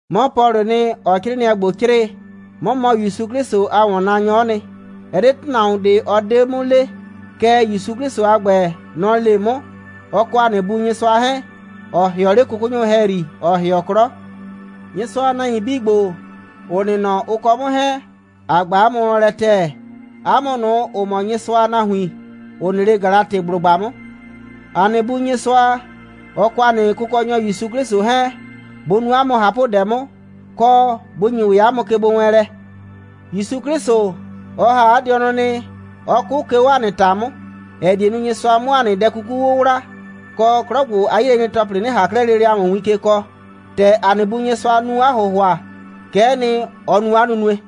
'Mɔ Pɔlʋʋ nɩ, ‑ɔɔ 'crɩɩnɩɛ ‑gbo 'crɩɩ. 'Mɔ mɔ ‑Yusu 'Klɩsʋ a ‑wɔnnaanyɔ'ɔ nɩ. Ɛ 'de ‑tʋnahuon ꞊de, ɔ 'de 'mʋ le. Kɛɛ, ‑Yusu 'Klɩsʋ a ‑gbɛ, nɔ‑ le 'mʋ, ɔ kɔ ‑a nɩ Bu Nyɩsʋa 'hɛɛn, ‑ɔ ‑hɩɔ 'le 'kʋkʋnyʋ ‑hɛyri, ‑ɔ ‑hɩɔ 'klɔ. Nyɩsʋa a nahuin 'bii ‑gbo, ‑ʋ nɩ nɔ, ʋ kɔ 'mʋ 'hɛɛn, ‑a ꞊gba 'a mʋ wlɔn lɛ ‑tɛɛ, 'a mʋ ꞊nʋ, ‑ʋ mɔ Nyɩsʋa a nahuin, ‑ʋ nɩ 'le Galatɩblʋgba 'mʋ. ‑A nɩ Bu Nyɩsʋa, ɔ kɔ ‑a nɩ Kʋkɔnyɔ ‑Yusu 'Klɩsʋ 'hɛɛn, bʋ nu 'a mʋ ꞊hapʋdɛ 'mʋ, kɔ, bʋ ‑nyi ‑wɛ 'a mʋ kegbowɛɛnlɛ. ‑Yusu 'Klɩsʋ, ɔ ‑ha 'a dɩɔnʋ nɩ, 'ɔ 'kʋ, 'ke 'o ‑a nɩ ‑ta 'mʋ, ‑ɛ die nu, Nyɩsʋa 'mʋ ‑a nɩ dɛ 'kuku 'wʋwla, kɔ, 'klɔ ‑gbo a 'yilɛnyre‑tɔplɩ 'nɩ ꞊han 'klɛɛ lele ‑a mʋ win ke kɔɔ. ‑Tɛ ‑a nɩ Bu Nyɩsʋa nu 'a ‑hʋhʋa, kɛ'ɛ nɩ, ɔ nu 'a nunue.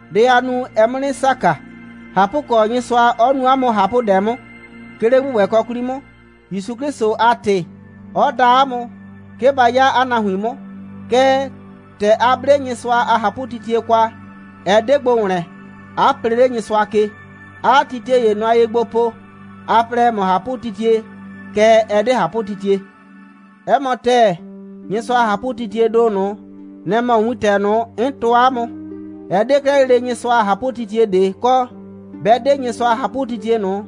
Dɛ aa nu, ɛɛ 'mʋ 'nɩ saka. ꞊Hapʋkɔ, Nyɩsʋa 'ɔ nu 'a mʋ ꞊hapʋdɛ 'mʋ, 'ke 'le ‑gbʋgbɛkɔ 'kwli 'mʋ, ‑Yusu 'Klɩsʋ a ‑tɩ, 'ɔ da 'a mʋ, 'ke ba 'ya 'a nahuin 'mʋ. Kɛɛ, ‑tɛ a 'ble Nyɩsʋa a ꞊hapʋtitie kwa, ɛ 'de gbo ‑wlɛn, 'a plee 'le Nyɩsʋa ke, 'aa titie ‑ye nʋa ye gbo po, a plɛ, ‑ɛ mɔ ꞊hapʋtitie, kɛɛ, ɛ 'de ꞊hapʋtitie. 'Ɛ mɔ ‑tɛɛ, Nyɩsʋa a ꞊hapʋtitiee ‑do ꞊nʋ, nɛ‑ mɔ wintɛ ꞊nʋ, 'n tɔɔ 'a mʋ. Ɛ 'de 'klɛɛ lele Nyɩsʋa a ꞊hapʋtitie ꞊de kɔ, 'bɛ 'de Nyɩsʋa a ꞊hapʋtitie ꞊nʋ,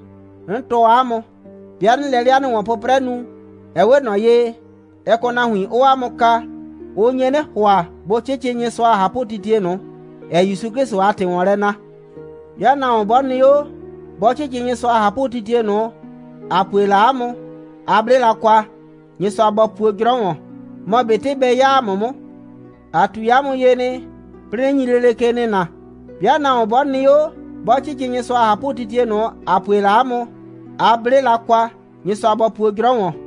'n tɔɔ 'a mʋ. 'Bɩa 'nɩɩ lɛ 'le 'a nɩ ‑wɔn'prɛɛlɛ nu, ɛ 'we ꞊nɔ ye, ɛ kɔ nahuin, 'ʋʋ 'a mʋ kaa. Ʋ nye 'nɩ ‑hʋa, bʋ 'cɩcɩ Nyɩsʋa a ꞊hapʋtitie ꞊nʋ, ‑ɛɛ ‑Yusu 'Klɩsʋ a ‑tɩ ‑wɔn lɛ na. 'Bɩa nahuon 'bɔ nɩ 'o, 'bɔ 'cɩcɩ Nyɩsʋa a ꞊hapʋtitie ꞊nʋ, ‑a pue la 'a mʋ, a 'ble la kwa, Nyɩsʋa bɔ puo 'jrɔ ‑wɔn, mɔ ꞊betɩ bɛ 'ya ‑a mʋ 'mʋ. ‑A ꞊tui 'a mʋ ye nɩ, 'plɩɩ 'nɩ nyi lele ke nɩna: 'Bɩa nahuon 'bɔ nɩ 'o, 'bɔ 'cɩcɩ Nyɩsʋa a ꞊hapʋtitie ꞊nʋ, ‑a pue la 'a mʋ, a 'ble la kwa, Nyɩsʋa bɔ puo 'jrɔ ‑wɔn.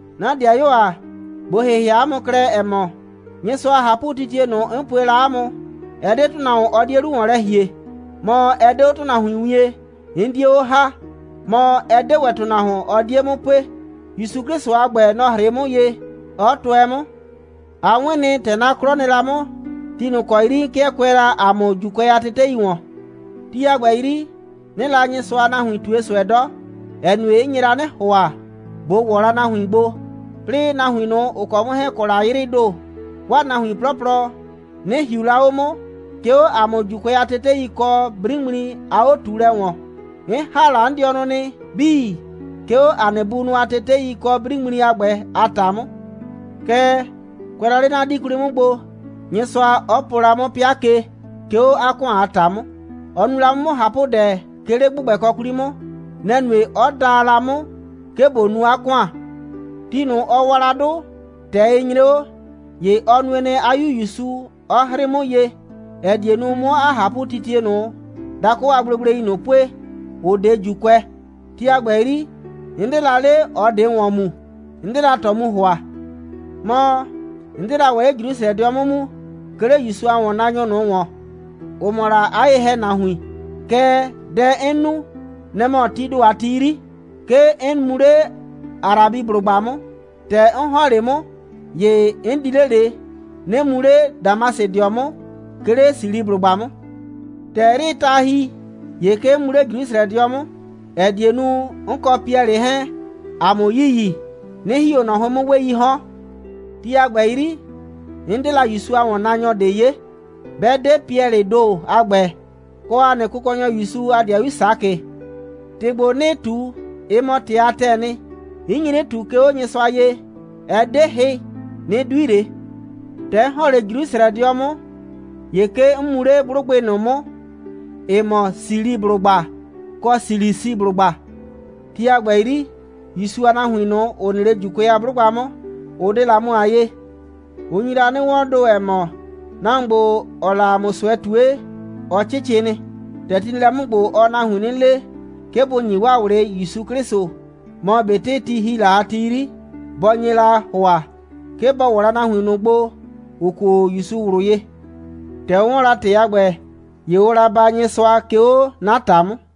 'Na 'dɩayuo ‑a, ꞊bo ‑hɩhɩa 'a mʋ klɛ, ‑ɛ mɔ, Nyɩsʋa a ꞊hapʋtitie ꞊nʋ, 'n pue la 'a mʋ, ɛ 'de ‑tʋnahuon, ɔ 'die 'lu ‑wɔn lɛ ‑hie, mɔ, ɛ 'de 'o ‑tʋnahuin wien, 'n 'die 'o ‑ha, mɔ, ɛ 'de ‑wɛ ‑tʋnahuon, ɔ 'die 'mʋ pue. ‑Yusu 'Klɩsʋ a ‑gbɛ, nɔ‑ 'hrɩɩ 'mʋ ye, 'ɔ tʋɛ 'mʋ. A 'wɩn nɩ, ‑tɛ 'na 'klɔ nɩ la 'mʋ, ti ꞊nʋ ‑kɔ 'yri 'n 'kɩɛ kʋɛ la ‑a mʋ ‑Juukʋɛ a tetei ‑wɔn. Ti a ‑gbɛ 'yri, 'nɩɩ la Nyɩsʋa a nahuin ꞊tue ꞊sʋɛ 'dɔ, ‑ɛ nue, 'n nye la 'nɩ ‑hʋa, ꞊bo ‑wɔ la 'a nahuin gbo, 'plɩɩ, nahuin ꞊nʋ, ‑ʋ kɔ 'mʋ 'hɛɛn‑ kɔ la 'yrɩɩ ‑do, 'waa nahuin 'plɔplɔ, 'nɩ ‑hiu la 'o 'mʋ, 'ke 'o ‑a mʋ ‑Juukʋɛ a tetei kɔ 'briŋmli a 'o꞊tuulɛ ‑wɔn. 'N ‑ha la 'n dɩɔnʋ nɩ 'bii, 'ke 'o ‑a nɩ bunʋ a tetei kɔ 'briŋmli a ‑gbɛ a ‑ta 'mʋ. Kɛɛ, kʋɛ la 'le 'na 'dii 'kwli 'mʋ gbo, Nyɩsʋa 'ɔ po la 'mʋ 'pɩa ke, 'ke 'o 'a ‑kʋan a ‑ta 'mʋ. Ɔ nu la 'mʋ 'mʋ ꞊hapʋdɛ, 'ke 'le ‑gbʋgbɛkɔ 'kwli 'mʋ. Nɛ‑ nue, 'ɔ da la 'mʋ, 'ke ꞊bo nu 'a ‑kʋan. Ti ꞊nʋ, ɔ wa la 'dʋ, ‑tɛ ɩ nyre 'o, ‑ye ɔ nue nɩ, 'a 'Yu ‑Yusu 'ɔ 'hrɩɩ 'mʋ ye, ‑ɛ die nu, 'mʋ 'a ꞊hapʋtitie ꞊nʋ dakʋ a gblegblei ꞊nʋ pue, ‑ʋ 'de ‑Juukʋɛ. Ti a ‑gbɛ 'yri, 'n 'de la 'le ꞊ɔ ꞊de ‑wɔn mu, 'n 'de la ꞊tɔ mu ‑hʋa. Mɔ, 'n 'de la ‑wɛ 'le Jrusrɛdɩɔ 'mʋ mu, 'ke 'le ‑Yusu a ‑wɔnnaanyʋ ꞊nʋ ‑wɔn, ‑ʋ mɔ la 'a ye‑hɛnahuin. Kɛɛ, dɛ 'n nu, nɛ‑ mɔ, tii ‑do a ti 'yri, 'ke 'n mu 'le Arabiblʋgba 'mʋ. ‑Tɛ 'n ‑hɔn 'le 'mʋ, ‑ye 'n di 'le ꞊le, 'nɩ mu 'le Damasɩdɩɔ 'mʋ, 'ke 'le Siliblʋgba 'mʋ. ‑Tɛ 'yrɩɩ ta ‑hi, ‑ye 'ke 'n mu 'le Jrusrɛdɩɔ 'mʋ, ‑ɛ die nu, 'n kɔ Piɛlɩ 'hɛɛn, ‑a 'mʋ yiyi, 'nɩ ‑hi 'o ꞊nɔ 'hʋɩn 'mʋ 'weeii 'hɔn. Ti a ‑gbɛ 'yri, 'n 'de la ‑Yusu a ‑wɔnnaanyɔ ꞊de 'ye, 'bɛ 'de Piɛlɩɩ ‑do a ‑gbɛ, kɔ ‑a nɩ Kʋkɔnyɔ ‑Yusu a 'dɩayu Sakɩ. ‑Tɩ ‑gbo, 'nɩɩ ꞊tu, ɩ mɔ ‑tɩ a ‑tɛɛ nɩ. 'N nyi 'nɩ ꞊tu, 'ke 'o Nyɩsʋa ye. Ɛ 'de hɩ, 'nɩ 'dui ꞊le. ‑Tɛ 'n ‑hɔn 'le Jrusrɛdɩɔ 'mʋ, ‑ye 'ke 'n mu 'le 'blʋgbɩ ꞊nʋ 'mʋ, ‑ɩ mɔ Siliblʋgba kɔ Silisiblʋgba. Ti a ‑gbɛ 'yri, ‑Yusu a nahuin ꞊nʋ, ‑ʋ nɩ 'le ‑Juukʋɛ a 'blʋgba 'mʋ, ʋ 'de la 'mʋ a 'yee. Ʋ nyi la 'nɩ 'wɔɔn ‑do, ‑ɛ mɔ: «Nahuon ‑gbo, ‑ɔɔ la ‑a mʋ ꞊sʋɛ ꞊tue, ɔ 'cɩcɩ nɩ. ‑Tɛ ti nɩ lɛ 'mʋ ‑gbo, ɔɔ nahuin 'nɩ le, 'ke bʋ ‑nyi 'waa ꞊wlɩ ‑Yusu 'Klɩsʋ, mɔ ꞊betɩ ti ‑hi la ti 'yri, bɔ nye la ‑hʋa, 'ke bɔ ‑wɔ la nahuin ꞊nʋ gbo, ‑ʋ kuo ‑Yusu ꞊wlʋ ye.» ‑Tɛ ʋ 'wɔn la ‑tɩ a ‑gbɛ, ‑ye ʋʋ la baa Nyɩsʋa, 'ke 'o 'na ‑ta 'mʋ.